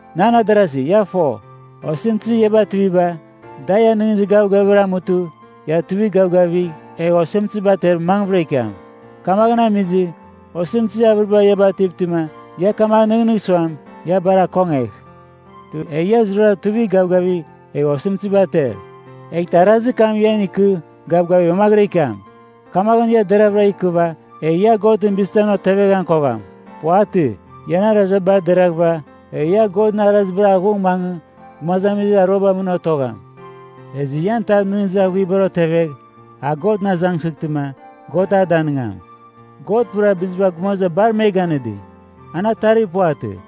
Nan adarasi, ia fo, osɨmtɨzir ia bativiba, da ian nɨghnɨzir gavgavibar amutɨ ia tuivigh gavgavigh egh osɨmtɨziba ater mangvɨra ikiam. Kamaghɨn amizɨ, osɨmtɨzir avɨriba ia bativtɨma ia kamaghɨn nɨghnɨgh suam, ia bar akongegh. Egh ia zurara tuivigh gavgavigh egh osɨmtɨziba ater. Eghtɨ arazir kam ian ikɨ gavgavigh mamaghɨra ikiam. Kamaghɨn ia deravɨra ikɨva, egh ia Godɨn bizitamɨn oteveghan kogham. Puvatɨ. Ian araziba bar deraghɨva, egh ia Godɨn arazibar aghung mangɨ gumazamizir aruabar mɨn otogham. Ezɨ ian tav nɨghnɨzir aghuibar otevegh, a Godɨn azangsɨghtɨma, God a danɨngam. God pura biziba gumaziba bar me ganɨdi, an atarir puvatɨ.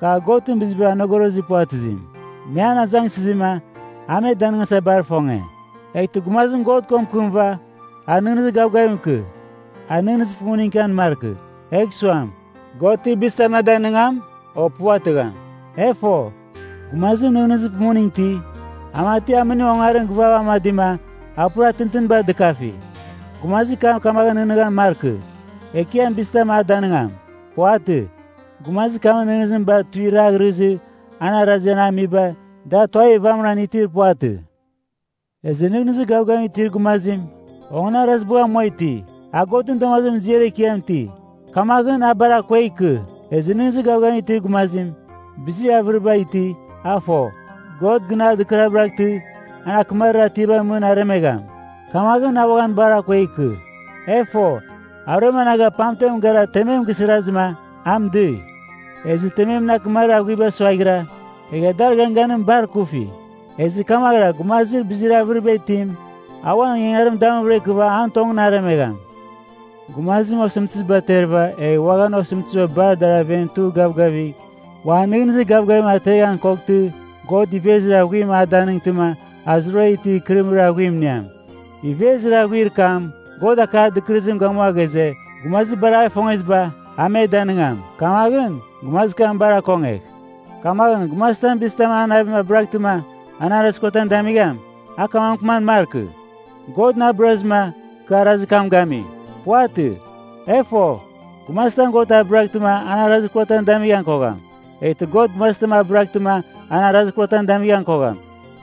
Kar Godɨn bizibar anogorozir puvatɨzim, me an azangsɨzima a me danɨngasa bar ifonge. Eghtɨ gumazim God ko mɨkɨmɨva, a nɨghnɨzir gavgavim ikɨ, a nɨghnɨzir pumuning ikian markɨ, egh suam, “God ti bizitam na danigam, o puvatɨgham?” E fo, gumazim nɨghnɨzir pumuning iti, a mati amɨnim ongarim givav amadima a pura tintinibar dɨkafi. Gumazir kam kamaghɨn nɨghnɨghan markɨ, Ekiam bizitam a danigham. Puvatɨ. Gumazir kamɨn nɨghnɨzim bar tuiraghrɨzɨ, an arazir an amiba, da tuavir vamɨran itir puvatɨ. Ezɨ nɨghnɨzir gavgavim itir gumazim, onganarazibagh amua iti, a Godɨn damazimɨn ziar ekiam iti. Kamaghɨn, a bar akuegh ikɨ. Ezɨ nɨghnɨzir gavgavim itir gumazim, bizir avɨriba iti, a fo, God gɨn a dɨkabɨraghtɨ an akɨmarir atiabar mɨn aremegham. Kamaghɨn, a uaghan bar akuegh ikɨ. E fo, aruem anaga pamtem gara temem gisirazɨma a mɨdɨi. Ezɨ tememɨn akɨmarir aghuiba suaghira, egha dar ganganim bar ikufi. Ezɨ kamaghɨra gumazir bizir avɨriba itim, a uan ingangarim damuvɨra ikɨva an tongɨn aremegham. Gumazim osɨmtɨziba aterɨva, egh uaghan osɨmtɨziba bar dar aven tugh gavgavigh, uan nɨghnɨzir gavgavim ateghan koghtɨ, God ivezir aghuim a danɨngtɨma a zurara itir ikɨrɨmɨrir aghuim iniam. Ivezir aghuir kam, God akar dɨkɨrɨzim gamua ghaze, gumazir bar a gifongeziba, a me danɨngam. Kamaghɨn, gumazir kam bar akongegh. Kamaghɨn gumazitam bizitam an navim abɨraghtɨma an arazir kuratam damigham, a kamaghɨn mɨkɨman markɨ, “God na abɨrazɨma kɨ arazir kam gami.” Puvatɨ. E fo, gumazitam God abɨraghtɨma an arazir kuratam damighan kogham, eghtɨ God gumazitam abɨraghtɨma an arazir kuratam damighan kogham.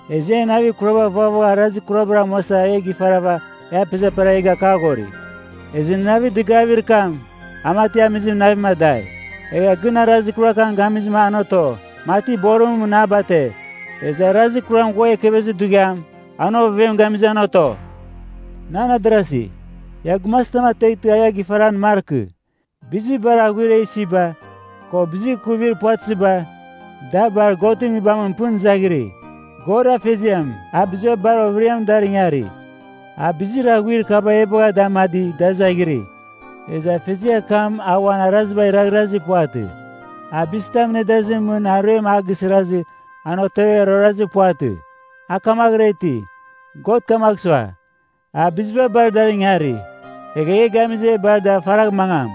Ezɨ en navir kuraba vaghvagha arazir kurabar amuasa e gifarava e apezeperava e gakaghori. Ezɨ navir dɨgavir kam, a mati amizim navim adai, egha gɨn arazir kuram gamizɨma an oto, mati borimɨn mɨn a bate. Ezɨ arazir kuram ghua ekevezir dughiam, an ovevem gamizɨma an oto. Nan adarasi, ia gumazitam ateghtɨ a ia gifaran markɨ. Bizir bar aghuir e isiba, ko bizir ikuvir puvatɨziba, da bar Godɨn Nguibamɨn pɨn izaghiri. God Afeziam a biziba bar overiam dar ingari, a bizir aghuir kaba e bagha da amadi da izaghiri. Ezɨ Afeziar kam a uan araziba raghrazir puvatɨ. A bizitamɨn nedazimɨn mɨn aruem a gisirazɨ an otevegha ruarazir puvatɨ. A kamaghɨra iti. God kamagh sua, a biziba bar dar ingari, egha e gamizɨ e bar dar faragh mangam.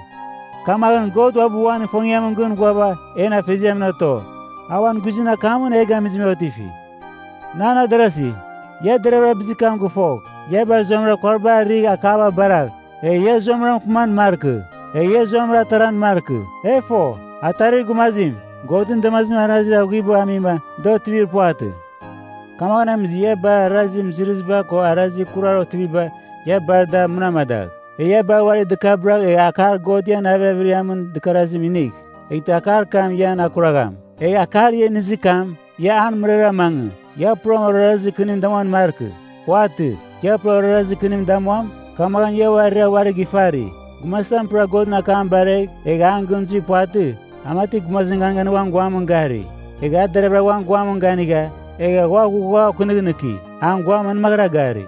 Kamaghɨn God uabɨ uan ifongiamɨn gɨn ghuava en Afeziamɨn oto, a uan guizɨn akamɨn e gamizɨma e otifi. Nan adarasi, ia deravɨra bizir kam gɨfogh. Ia bar zuamɨra kuariba arɨgh akaba baragh, egh ia zuamɨra mɨkɨman markɨ, egh zuamɨra ataran markɨ. E fo, atarir gumazim, Godɨn damazimɨn arazir aghuibagh amima da otivir puvatɨ. Kamaghɨn amizɨ ia bar arazir mɨzɨrɨziba ko arazir kurar otiviba, ia bar ada munamadagh. Egh ia bar uari dɨkabɨragh egh akar God ian navir averiamɨn dɨkarazim inigh. Eghtɨ akar kam ian akuragham. Egh akar ia inizir kam, ia an mɨrara mangɨ. Ia puram orarazir kɨnim damuan markɨ. Puvatɨ. Ia pura orarazir kɨnimɨn damuam, kamaghɨn ia uarira uarigh ifari. Gumazitam pura Godɨn akam baregh, egh an gɨn zuir puvatɨ, a mati gumazim ganganimɨn uan guamɨn gari. Egha a deravɨra uan guamɨn ganigha, egha ua ghugha okɨnɨghnɨki, an guam manmaghɨra gari.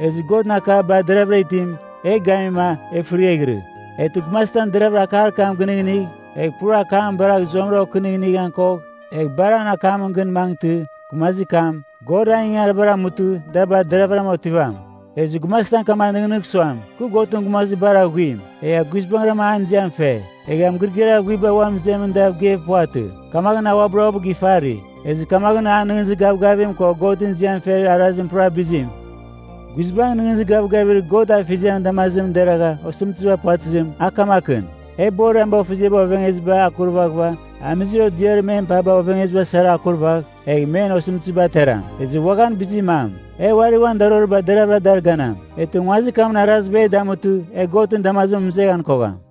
Ezɨ Godɨn akar bar deravɨra itim e gamima e fɨriaghɨrɨ. Eghtɨ gumazitam deravɨra akar kam gɨnɨghnɨgh, egh pura akam baragh zuamɨra okɨnɨghɨnɨghan kogh, egh bar an akamɨn gɨn mangɨtɨ, gumazir kam, God an ingangaribar amutɨ da bar deravɨram otivam. Ezɨ gumazitam kamaghɨn nɨghnɨgh suam, “Kɨ Godɨn gumazir bar aghuim, egha guizbangɨra an ziam fe,” egha mɨgɨrɨgɨar aghuibar uan mɨzemɨn dav geir puvatɨ, kamaghɨn a uabɨra uabɨ gifari. Ezɨ kamaghɨn an nɨghnɨzir gavgavim ko Godɨn ziam fer arazim pura bizim. Guizbangɨn nɨghnɨzir gavgavir God Afeziamɨn damazimɨn deragha osɨmtɨziba puvatɨzim, a kamakɨn: E borir ameboghfeziaba ovengezibar akurvaghɨva, amizir odiarir men paba ovengeziba sarama akurvagh, egh men osɨmtɨziba ateram. Ezɨ uaghan bizir mam, e uari uan daroriba deravɨra dar ganam, eghtɨ nguazir kamɨn araziba e damutɨ e Godɨn damazimɨn mɨzeghan kogham.